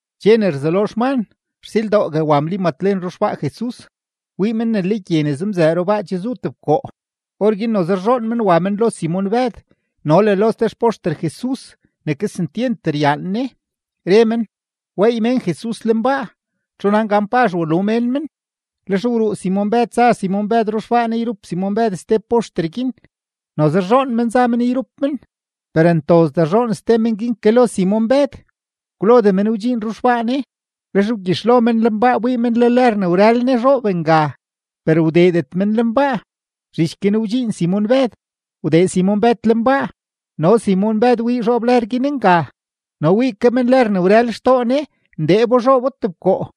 Dxe ne rzelo xman, rsildoogue wa Mli Matlen ruxbaa Jesus, wii men ne le gye ne zemzëë rubaa che zu tebkoo. Orguin noze rzhoon men wa men lo Simon-Bëd no le lo ste xpoxter Jesus ne kesentyent ryaan Ne, re men: ―Weey mén Jesus lenbaa; txu nan gan pazh walu mén men. Lex wruu Simon-Bëd za Simon-Bëd ruxbaa Ne yrup Simon-Bëd ste poxter guin. Noze rzhoon men za men yrup men; per ntozdee rzhoon ste men guin ke lo Simon-Bëd, kwlodee men wdxiin ruxbaa Ne. Lex wgyixlo men lenbaa wii men le lër ne wrël Ne zhoob nga, per wdeedet men lenbaa. Zhich guin wdxiin Simon-Bëd, wdee Simon-Bëd lenbaa no Simon-Bëd wii zhoob lër guin nga no wii ke men lër ne wrël xtoo Ne ndeebo zhoobo tebkoo,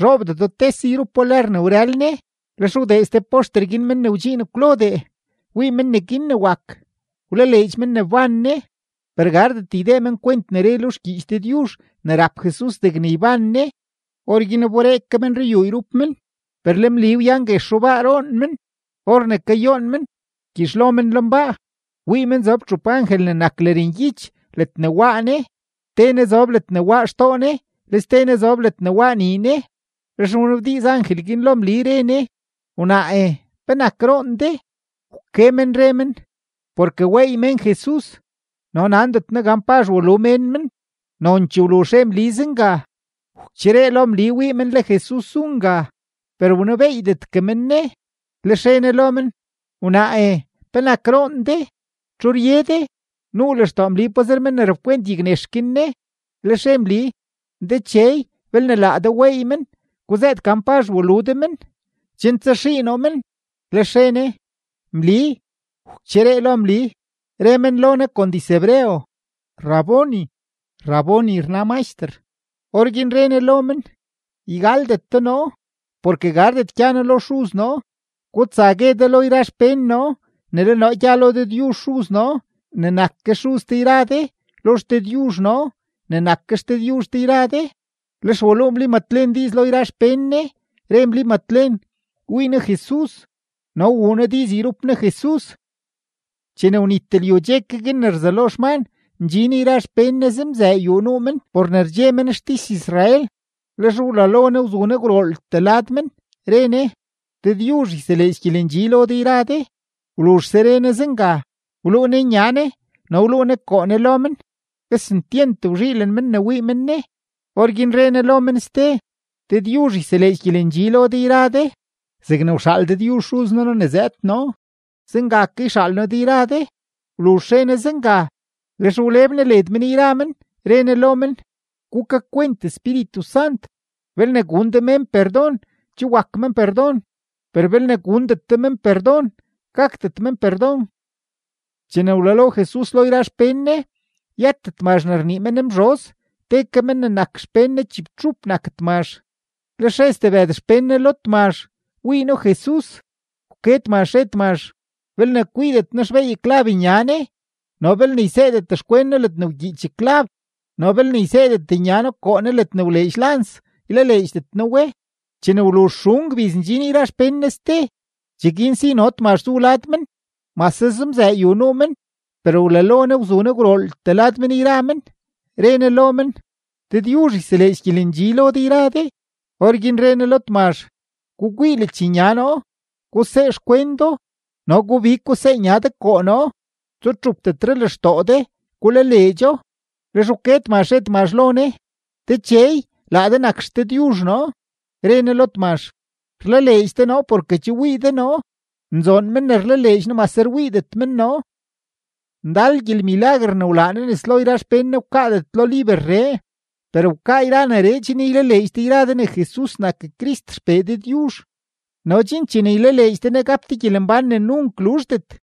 zhoobdeto tese yrupo lër ne wrël Ne. Lex wdee ste poxter guin, men ne wdxiin kwlodee; wii men neguin ne wak, wlaleedx men ne wban Ne. Per gardet ydee men kwent ne re lo xgyiich Dëdyuzh ne rap Jesus degne yban Ne. Orguin wberee ke men ruyuu yrup men. Per le Mli wyan guex rubaa roon men; orguin ne kayoon men, wgyixlo men lenbaa, wii men zob txup angel ne nak lërngyich ledne waa Jesus, te ne zob ledne waa xtoo Ne, le ste ne zob ledne waa nii Ne. Lex wnabdiiz angel guin lo Mli, re ne: ―Wnaae, ¿penak roon de? Wke men re men: ―Porke weey mén Jesus, no nandet noo gan pazh walu mén men. Nonchee wluzh re Mli zenga, wcheree lo Mli wii men le Jesus zu nga, per wnebeeydetgue men Ne. Lex re Ne lo men: ―Wnaae, ¿penak roon de? ¿Txu rye de? Nuu lextoo Mli pazer men ne rapkwent yagnex guin ne, lex re Mli: ―Dechey, belne laa de weey men, guzëët gan pazh walu de men, chen tsaxii noo men. Lex re Ne: ―¡Mli! Wcheree lo Mli, re men lo Ne kon diz-hebreo: ―¡Raboni! (Raboni rna Maxter.) Orguin re Ne lo men: ―Ygaldet de noo, porke gardet gya noo lo Xuz noo. Gutsa gue de lo yra xpén noo ne le noo gya lo Dëdyuzh Xuz noo ne nak ke Xuz de yra de, lo XDëdyuzh noo ne nak ke XDëdyuzh de yra de. Lex waluu Mli Matlen diiz lo yra xpén Ne, re Mli Matlen: “Wii noo Jesus no wuu noo diiz yrup noo Jesus.” Chene wnit lyu dxe ke guin ne wzelo xman, ndxin yra xpén Jesus, zemzëë yuu nuu men por ne rdxe men xtis-Israel. Lex wlalo Ne, wzu Ne gwrooltee lad men, re Ne: ―Dëdyuzh yseleedx gyelendxi lo de yra de. Wluzhse re Ne zenga, wluu Ne nya Ne no wluu Ne koo Ne lo men. Kesentyent wzhiilen men ne wii men Ne. Orguin re Ne lo men ste: ―Dëdyuzh yseleedx gyelendxi lo de yra de. Zegne wxaal Dëdyuzh Xuz noo noo ne zëëd noo, zenga ke yxaal noo de yra de. Wluzh re Ne zenga, lex wleb Ne led men yra men, re Ne lo men: ―Gukakwent Espíritu Sant. Belne gun de mén perdon, che wak men perdon; per belne gundet de men perdon, gakdet men perdon. Chene wlalo Jesus lo yra xpén Ne, yët Tmazh ne rnii men Mzhoz, te ke men ne nak xpén Ne chibtxup nak Tmazh. Lex re stebëd xpén Ne lo Tmazh: ―Wii noo Jesus. Wke Tmazh, re Tmazh: ―Belne kwiidet noo xbeey klab nya Ne no belne yseedet xkwen noo ledne wgyiich klab no belne yseedet nya noo koo Ne ledne wleedx lans, ylaleedxdet noo we. Chene wluzh xun gbiz, ndxin yra xpén Ne ste, cheguin si no Tmazh zu lad men; mase zemzëë yuu nuu men, per wlalo Ne, wzu Ne gwrooltee lad men yra men, re Ne lo men: ―Dëdyuzh yseleedx gyelendxi lo de yra de. Orguin re Ne lo Tmazh: ―Gukwii ledxnya noo, gusee xkwen do, no gubig gusee nya de koo noo. Tsutxupdetre lextoo de, gulaleedxo. Lex wke Tmazh, re Tmazh lo Ne: ―Dechey, laa de nak XDëdyuzh noo. Re Ne lo Tmazh: ―Rlaleedx de noo porke che wii de noo; nzoon men ne rlaleedx noo mase rwiidet men noo. Ndal gyelmilaguer ne wlaa Jesus nes lo yra xpén Ne wkaadet lo liberree. Per wkaa yra neree chen ylaleedx de yra de ne Jesus nak Crist XPee Dëdyuzh no chen chene ylaleedx de Ne, gap de gyelembán ne nunk luzhdet.